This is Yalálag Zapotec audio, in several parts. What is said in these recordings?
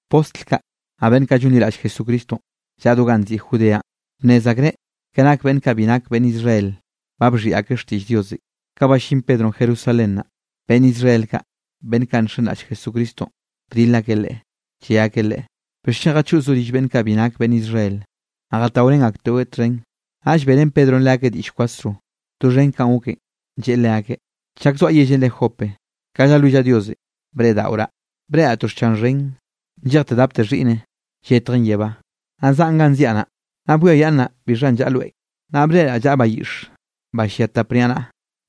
Postl kaꞌ, naꞌ beꞌnn kaꞌ llonliraꞌll Jesucristonꞌ llaꞌa do ganꞌ nziꞌi Judeanꞌ, bnnez akreꞌ ke nak beꞌnn kaꞌ bi nak beꞌnn Israel, ba bxhiꞌi akeꞌ xtiꞌll Diosenꞌ. Ka ballín Pedronꞌ Jerusalén naꞌ, beꞌnn Israel kaꞌ, beꞌnn kaꞌ nxenraꞌll Jesucristonꞌ, bdil akeꞌ leꞌe, lle akeꞌ leꞌe: —¿Bixchen jachoꞌzoꞌ rill beꞌnn kaꞌ bi nak beꞌnn Israel, naꞌ jataorén akteꞌweꞌ txhen? Naꞌll beꞌrén Pedronꞌ leakeꞌ diꞌll kwasro doxhen kanꞌ goken, lleꞌe leakeꞌ: —Chak zoaꞌ yellenꞌ re Jope, ka llalwillaꞌ Diosenꞌ breꞌdaꞌoraꞌ, breꞌraꞌ to xchan xhen nllejten dapte xhiꞌne, lletjen yebá, naꞌ zaꞌn ganꞌ ziaꞌ naꞌ. Naꞌ bwiayaꞌnnaꞌ bixhanꞌ llaꞌa loenꞌ, naꞌ breꞌraꞌ llaꞌa bayiꞌx ba llia tap niaꞌnaꞌa,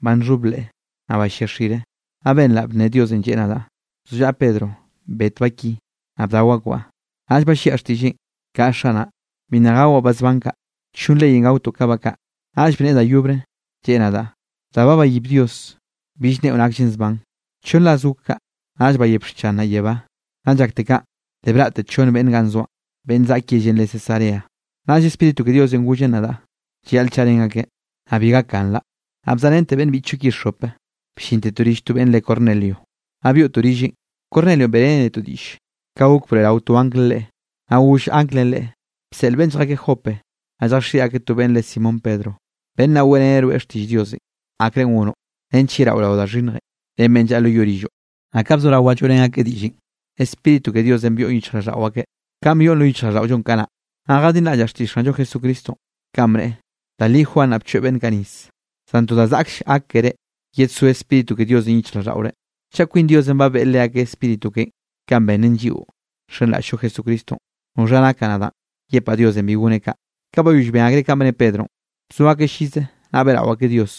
ba llxhob leꞌe, naꞌ ba llia xire. Naꞌ benraꞌ bne Diosenꞌ lleꞌe nadaꞌ: “Bzollaꞌa Pedro, bet ba ki, naꞌ bdao akbaꞌ.” Naꞌll balliaꞌ xtiꞌlleꞌn: “Kaꞌa, Xanaꞌ, bi nna gawaꞌ ba zban kaꞌ, nllon leyenꞌ gaotoꞌ ka ba kaꞌ.” Naꞌll bneꞌe da yobre, lleꞌe nadaꞌ: “Da ba bayib Dios, bill nneꞌo nakllen zban.” Chonn ras gok kaꞌ, naꞌll bayep xchan naꞌ yebá. Nnaꞌ llakte kaꞌn, le braꞌte chonn beꞌnn ganꞌ zoaꞌn, beꞌnn zaꞌk yellenꞌ re Cesarea. Naꞌll Spíritu ke Diosenꞌ gollen nadaꞌ llayaꞌl chaꞌrén akeꞌ, naꞌ bi gakganraꞌ. Naꞌ bzaꞌrente beꞌnn biꞌchllo ki xope, bllintetoꞌ rill to beꞌnn re Cornelio, naꞌ byoꞌtoꞌ rilleꞌn. Cornelionꞌ beꞌreneꞌ netoꞌ diꞌll ka gok broeꞌrao to anglenꞌ leꞌe, naꞌ goll anglenꞌ leꞌe: “Bseꞌl beꞌnn lljakeꞌ Jope, naꞌ lljaxiꞌi akeꞌ to beꞌnn re Simón Pedro. Beꞌnn naꞌ weꞌreneꞌ rweꞌ xtiꞌll Diosenꞌ akre gonoꞌ, nench yeraꞌo rao da xhinnjenꞌ ren beꞌnn llaꞌa lo yoꞌ rilloꞌ.” Naꞌ ka bzorawaꞌ lloeꞌrén akeꞌ diꞌllenꞌ, Spíritu ke Diosenꞌ byoꞌn yichjraꞌlldaꞌo akeꞌ, kanꞌ byoꞌn lo yichjraꞌlldaꞌollonꞌ kanaꞌ. Naꞌ jadinraꞌllaꞌ xtiꞌll Xanllo Jesucristonꞌ, kanꞌ bneꞌe: “Da li Juan naꞌ bchoeꞌ beꞌnn kaꞌ nis, zan to da zaꞌkll gak keré yedsó Spíritu ke Diosenꞌ yichjraꞌlldaꞌore.” Chaꞌ kwin Diosenꞌ ba beꞌe leakeꞌ Spíritu keꞌen kanꞌ benneꞌn lliꞌo nxenraꞌll-llo Jesucristonꞌ, ¿noxha nakaꞌ nadaꞌn yepaꞌ Diosenꞌ bi goneꞌ kaꞌ? Ka bayoll ben akreꞌ kanꞌ bne Pedronꞌ, bzo akeꞌ llize naꞌ beꞌrao akeꞌ Dios,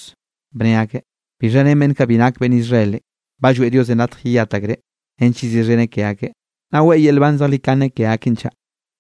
bne akeꞌ: —¿Bixha ren beꞌnn kaꞌ bi nak beꞌnn Israelenꞌ, ba lloeꞌ Diosenꞌ latj yeyat akreꞌ nench yeziꞌxheneꞌ ke akeꞌ, naꞌ weꞌe yel nban zejlikane ke akeꞌn chaꞌ?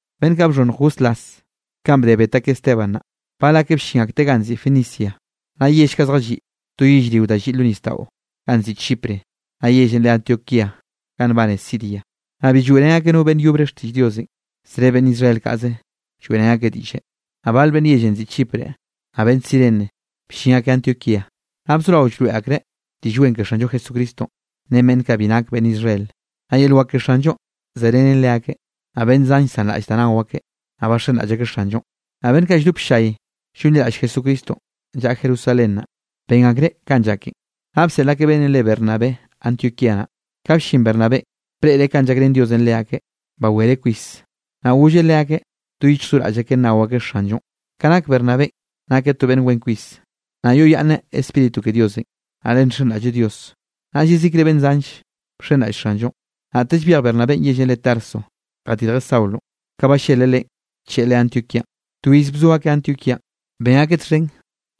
Beꞌnn kaꞌ bxhonnj goslas kanꞌ bde bet akeꞌ Esteban naꞌ, bal akeꞌ bllin akteꞌ ganꞌ nziꞌi Fenicia, naꞌ yell kaꞌ zjalliꞌ to yellrio da lliꞌ lo nisdaꞌo ganꞌ nziꞌi Chipre, naꞌ yellenꞌ re Antioquía ganꞌ nbane Siria. Naꞌ bi lloeꞌrén akeꞌ no beꞌnn yobre xtiꞌll Diosenꞌ, zre beꞌnn Israel kaꞌze lloeꞌrén akeꞌ diꞌlle. Naꞌ bal beꞌnn yellenꞌ nziꞌi Chipre, naꞌ beꞌnn Cirene bllin akeꞌ Antioquía, naꞌ bzorao llroeꞌ akreꞌ Diꞌll Wen ke Xanllo Jesucristonꞌ, ren beꞌnn kaꞌ bi nak beꞌnn Israel. Naꞌ yel wak ke Xanllonꞌ zerenen leakeꞌ. Naꞌ beꞌnn zan llsanraꞌll da nao akeꞌ, naꞌ baxenraꞌll akeꞌ Xanllonꞌ. Naꞌ beꞌnn kaꞌ lldop ll-llay llonliraꞌll Jesucristonꞌ llaꞌa Jerusalén naꞌ, ben akreꞌ kanꞌ llaken, naꞌ bseꞌl akeꞌ beꞌnnenꞌ re Bernabé Antioquía naꞌ. Ka bllin Bernabénꞌ, breꞌreꞌ kanꞌ llakrén Diosenꞌ leakeꞌ bawereꞌ kwis, naꞌ golleꞌ leakeꞌ do yichj do raꞌll akeꞌ nnao akeꞌ Xanllonꞌ. Ka nak Bernabénꞌ nakeꞌ to beꞌnn wen kwis, naꞌ yoꞌyaꞌnneꞌ Spíritu ke Diosenꞌ, naꞌ le nxenraꞌlleꞌ Dios, naꞌll yezikre beꞌnn zanll bxenraꞌll Xanllonꞌ. Naꞌtell byej Bernabénꞌ yellenꞌ re Tarso jadirjeꞌ Saulonꞌ, ka balleleꞌ leꞌen, bcheꞌe leꞌe Antioquíanꞌ. To iz bzo akeꞌ Antioquíanꞌ, ben akeꞌ txhen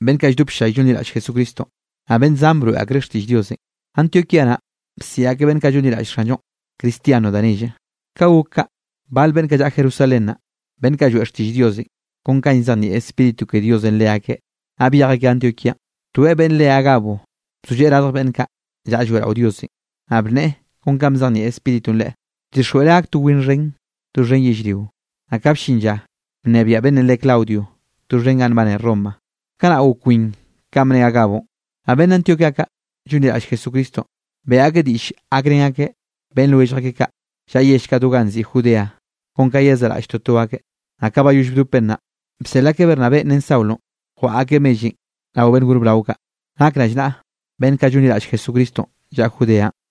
beꞌnn kaꞌ lldop ll-llay llonliraꞌll Jesucristonꞌ, naꞌ beꞌnn zan broeꞌ akreꞌ xtiꞌll Diosenꞌ. Antioquía naꞌ bsiꞌi akeꞌ beꞌnn kaꞌ llonliraꞌll Xanllonꞌ, Cristiano da nelle. Ka gok kaꞌ, bal beꞌnn kaꞌ llaꞌa Jerusalén, beꞌnn kaꞌ lloeꞌ xtiꞌll Diosenꞌ kon ka llzejnieꞌ Spíritu ke Diosenꞌ leakeꞌ, naꞌ byej akeꞌ Antioquíanꞌ. Toeꞌ beꞌnn re Agabo bzolleꞌe radj beꞌnn kaꞌ llaꞌa lloeꞌrao Diosenꞌ, naꞌ bneꞌe kon kanꞌ bzejnieꞌ Spíritunꞌ leꞌe, bdixjweꞌreꞌ gak to win xhen doxhen yellrio. Naꞌ ka bllin lla bnebiaꞌ beꞌnnenꞌ re Claudio doxhen ganꞌ nbane Roma, kanaꞌ gok win kanꞌ bne Agabonꞌ. Naꞌ beꞌnn Antioquía kaꞌ llonliraꞌll Jesucristonꞌ, beꞌe akeꞌ diꞌll gakrén akeꞌ beꞌnn lwellj akeꞌ kaꞌ llaꞌa yell kaꞌ do ganꞌ nziꞌi Judea, kon ka yezaꞌraꞌll toto akeꞌ. Naꞌ ka bayoll bdopen naꞌ, bseꞌl akeꞌ Bernabénꞌ ren Saulonꞌ jwaꞌa akeꞌ mellenꞌ rao beꞌnn gor brao kaꞌ, nak rallnaꞌa beꞌnn kaꞌ llonliraꞌll Jesucristonꞌ llaꞌa Judeanꞌ.